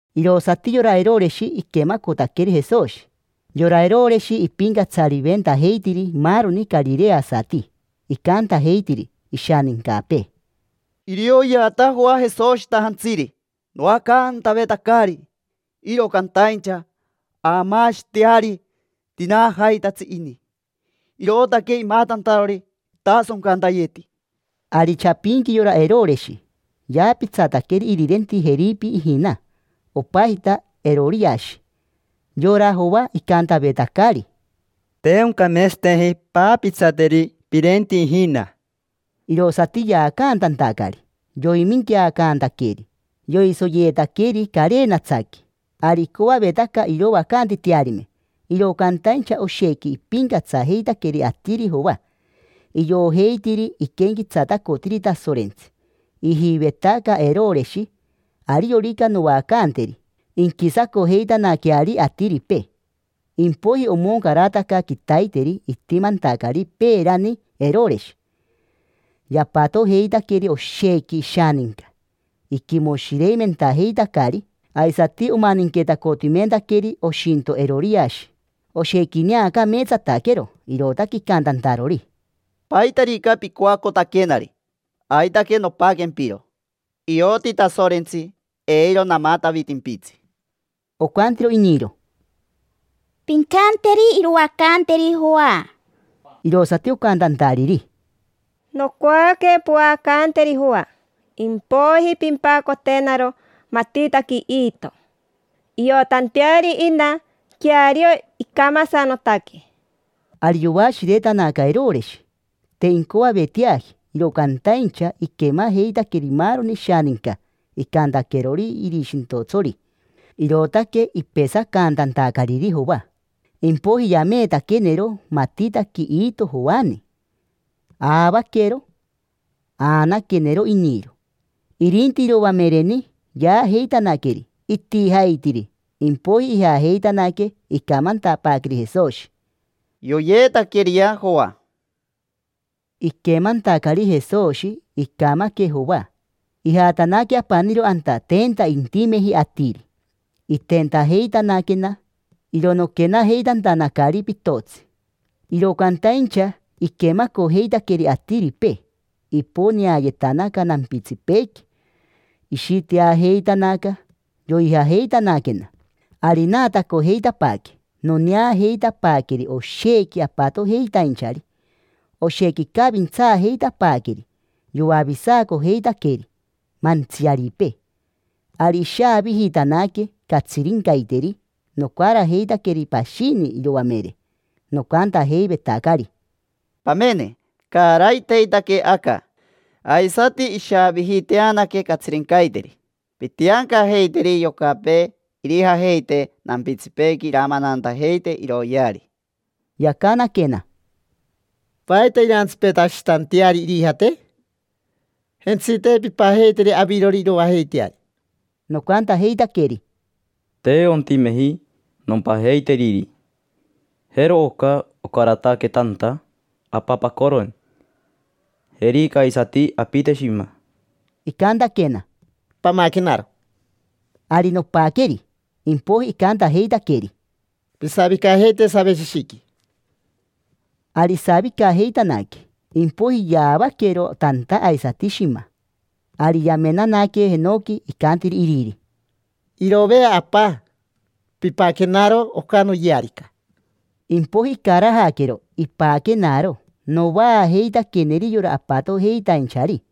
Irosati yora Eroreshi iquemacotaqueri Jesoshi. Yora Eroreshi ipincatsariventajeitiri maaroni carireasati. Icantajeitiri ishanincapee: —Irioyeata Joa Jesoshitajantsiri. Noacantavetacari, iro cantaincha aamaashiteari tinaanajaitatsi ini, irootaque imatantarori itasoncantayeti. Ari chapinqui yora Eroreshi yaapitsataqueri irirenti Jeripe ijina, opajita Eroriashi. Yora Joa icantavetacari: “Te oncameetsateji paapitsateri pirenti ijina”. Irosati yaacantantacari, yoiminqueacantaqueri. Yoisoyeetaqueri carenatsaqui. Ari icoavetaca iroacantitearime, iro cantaincha oshequi ipincatsajeitaqueri atiri Joa, iojeitiri iquenquetsatacotiri Tasorentsi. Ijivetaca Eroreshi: “Ariorica noacanteri, inquisacojeitanaqueari atiripee”. Impoiji omoncarataca quitaiteri itimantacari peerani Eroreshi. Yapatojeitaqueri oshequi ishaninca, iquimoshireimentajeitacari. Aisati omaninquetacotimentaqueri oshinto Eroriashi. Oshequi ineacameetsataquero, irootaque icantantarori: —Paitarica pincoacotaquenari, aitaque nompaquempiro. Ioti Tasorentsi eiro namatavitimpitsi. Ocantiro iniro: —Pincanteri iroacanteri Joa. Irosati ocantantariri: —Nocoaque poacanteri Joa, impoiji pimpacotenaro matitaqui iitoni, iotanteari ina queario icamasanotaque. Ari yoashiretanaca Eroreshi. Te incoaveteaji, iro cantaincha iquemajeitaqueri maaroni ishaninca icantaquerori irishintotsori. Irootaque ipesacantantacariri Joa. Impoiji yameetaquenero matitaqui iito Joani. Aavaquero, aanaquenero iniro. Irinti iroamereni yaajeitanaqueri, itijaitiri. Impoiji ijajeitanaque, icamantapaaqueri Jesoshi: —Yoyeetaqueriyea Joa. Iquemantacari Jesoshi icamaque Joa, ijatanaque apaniro anta tenta intimeji atiri. Itentajeitanaquena, iro noquenajeitantanacari pitotsi. Iro cantaincha iquemacojeitaqueri atiripee, iponeayetanaca nampitsipeequi, ishiteajeitanaca, yoijajeitanaquena. Ari naatacojeitapaaque, noneajeitapaaqueri oshequi apatojeitainchari. Oshequi icavintsaajeitapaaqueri, yoavisacojeitaqueri mantsiaripee. Ari ishaavijitanaque catsirincaiteri. Nocarajeitaqueri pashini iroamere, nocantajeivetacari: —Pamene, caraiteitaque aca, aisati ishaavijiteanaque catsirincaiteri. Pintiancajeiteri yocapee irijajeite nampitsipeequi iramanantajeite iroyeari. Yacanaquena: —¿Paita irantsipetashitanteari irijate? Jentsite, pimpajeiteri avirori iroajeiteari. Nocantajeitaqueri: —Te ontimeji nompajeiteriri. Jero oca ocarataque tanta apapacoroni. Jerica aisati apite shima. Icantaquena: —Pamaquenaro. Ari nopaqueri. Impoiji icantajeitaqueri: —Pisavicajeite saveshishiqui. Ari isavicajeitanaque. Impoiji yaavaquero tanta aisati shima. Ari yamenanaque jenoqui, icantiri iriri: —Irove, Apa, pipaquenaro oca noyearica. Impoiji icarajaquero, ipaquenaro. Novaajeitaqueneri yora apatojeitainchari.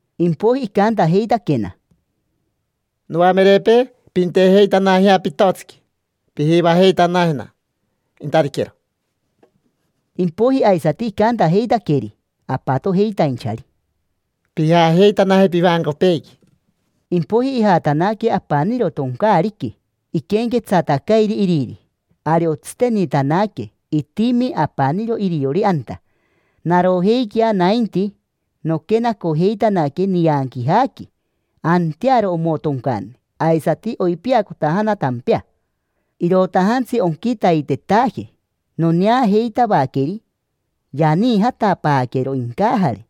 Impoiji icantajeitaquena: —Noamerepee, pintejeitanajea pitotsiqui, pijivajeitanajena intatiquero. Impoiji aisati icantajeitaqueri apatojeitainchari: —Pijajeitanaje pivancopeequi. Impoiji ijatanaque apaniro toncaariqui, iquenquetsatacairi iriri. Ari otsitenitanaque, itimi apaniro iriori anta. Narojeiquea nainti, noquenacojeitanaque nianquijaqui. Antearo omotoncane, aisati oipiacotajana tampea. Irotajantsi onquitaitetaje noneajeitavaqueri, yaniijatapaaquero incajare,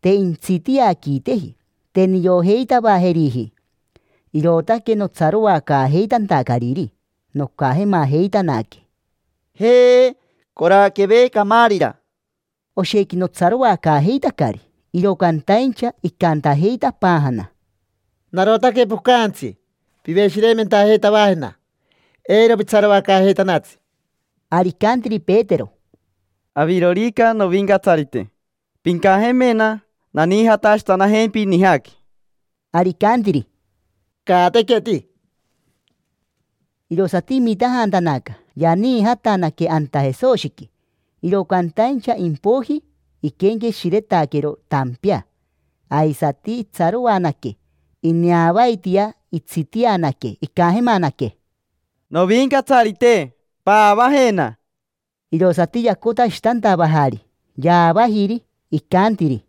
te intsitiaquiteji. Te niojeitavajeriji, irootaque notsaroacaajeitantacariri, nocajemajeitanaque: —Jeee. Coraqueve camaarira. Oshequi notsaroacaajeitacari. Iro cantaincha icantajeitapaajana: —Narotaque pocajantsi, piveshireimentajeitavajena, eiro pitsaroacaajeitanatsi. Ari icantiri Petero: —Avirorica novincatsarite, pincajemena naniijatashitanajempi nijaqui. Ari icantiri: —Caatequeti. Irosati imitajantanaca, yaniijatanaque anta Jesoshiqui. Iro cantaincha impoiji iquenqueshiretaquero tampea, aisati itsaroanaque. Ineavaitia itsitianaque, icajemanaque: —Novincatsarite, paavajena. Irosati yacotashitantavajari, yaavajiri. Icantiri: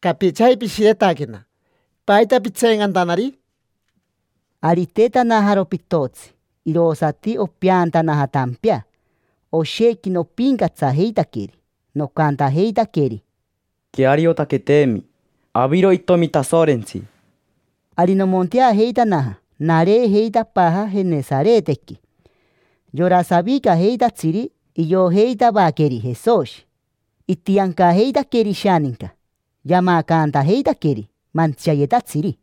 —Capichaji pishiretaquena, ¿paita pitseencantanari? Ari itetanajaro pitotsi, irosati opeantanaja tampea. Oshequi nopincatsajeitaqueri, nocantajeitaqueri: —Queariotaqueteemi, aviro Itomi Tasorentsi. Ari nomonteajeitanaja, nareejeitapaaja Jenesaretequi. Yora savicajeitatsiri iojeitavaqueri Jesoshi, itiancajeitaqueri ishaninca, yamacantajeitaqueri mantsiayetatsiri.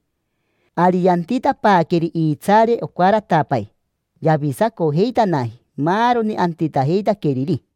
Ari yantitapaaqueri iitsaare ocaratapai. Yavisacojeitanaji maaroni antitajeitaqueriri.